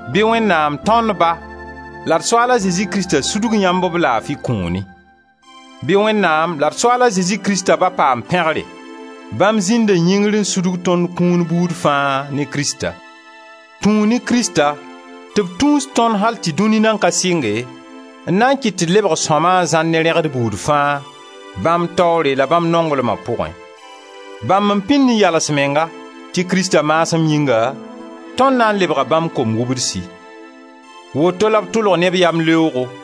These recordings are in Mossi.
Bɩ Wẽnnaam, tõnd Ba la d Soaal a Zezi Krista sudg yãmb b laafi kũuni! Bɩ Wẽnnaam la d Soaal a Zezi Krista Ba paam pẽgre! Bãmb zĩnda yĩngr n sudg tõnd kũun buud fãa, ne Krista. Tũu ne Krista tɩ b tũus tõnd al tɩ dũni nan ka sɩnge, n na n kɩt tɩ d lebg sõma n zãr ne rẽgd buud fãa, bãmb taoore la bãmb nonglma pʋgẽ. Bãmb n pĩnd n yals menga tɩ Krista maasem yĩnga, tõnd na n lebga bãmb kom-wubdsi. Woto la b tʋlg ne b yamleoogo,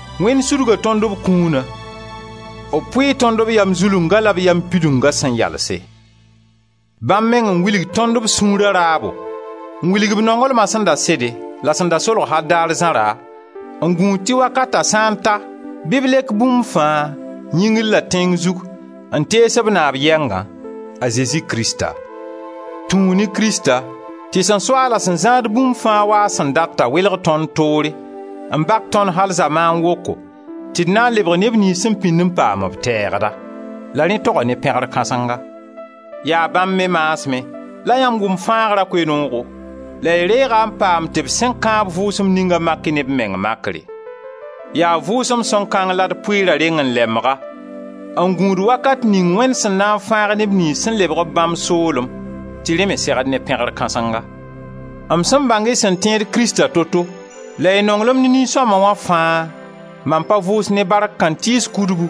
Wẽnd sudga tõnd b kũuna, b pʋɩɩ tõnd b yam zulungã la b yam pidungã Bãmb meng n wilg tõnd b sũura raabo, n wilg b nonglma sẽn da sede, la sẽn da solg al daar zãra n gũud tɩ wakata sã n ta bɩ b lek bũmb fãa, yĩngr la tẽng zug, n tees b Naab yɛngã, a Zezi Krista. Tũu ne Krista tɩ sẽn so-a la a zãad bũmb fãa wa a sẽn datã, welg tõnd toore, n bak tõnd al zamaan woko, tɩ d na n lebg neb niyns sẽn pĩnd n paam b teegda; la rẽ toga ne pẽgr kãsenga. Yaa bãmb me maasmẽ la yãmb wʋm fãagra Koe-noogo la y reeg-a n paam tɩ b sẽn kãab Vʋʋsem ninga mak-y ne b meng makre. Yaa Vʋʋsem Sõng kãng la d pʋɩɩra reng-n-lembga, n gũud wakat ning Wẽnd sẽn na n fãag neb niyns sẽn lebg b bãmb soolem, tɩ rẽ me segd ne pẽgr kãsenga. M sẽn bãng y sẽn tẽed Krista toto la y nonglem ne nin-sõma wã fãa mam pa vʋʋs ne bark kãntɩɩs kudbu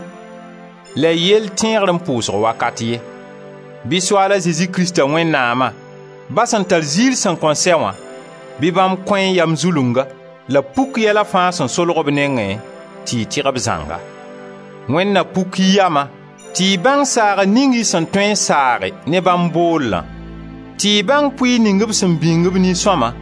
la y yell tẽegr m pʋʋsg wakat ye. Bɩ Soaal a Zezi Krista Wẽnnaama, Ba sẽn tar ziir sẽn kõn sɛ wã, bɩ bãmb kõ-y yam zulunga, la b puk yɛla fãa sẽn solg b nengẽ tɩ y tɩg b zãnga. Wẽnd na puk y yama tɩ y bãng saagr ning y sẽn tõe n saage ne bãmb boollã; tɩ y bãng pʋɩɩr ning b sẽn bĩng b nin-sõma,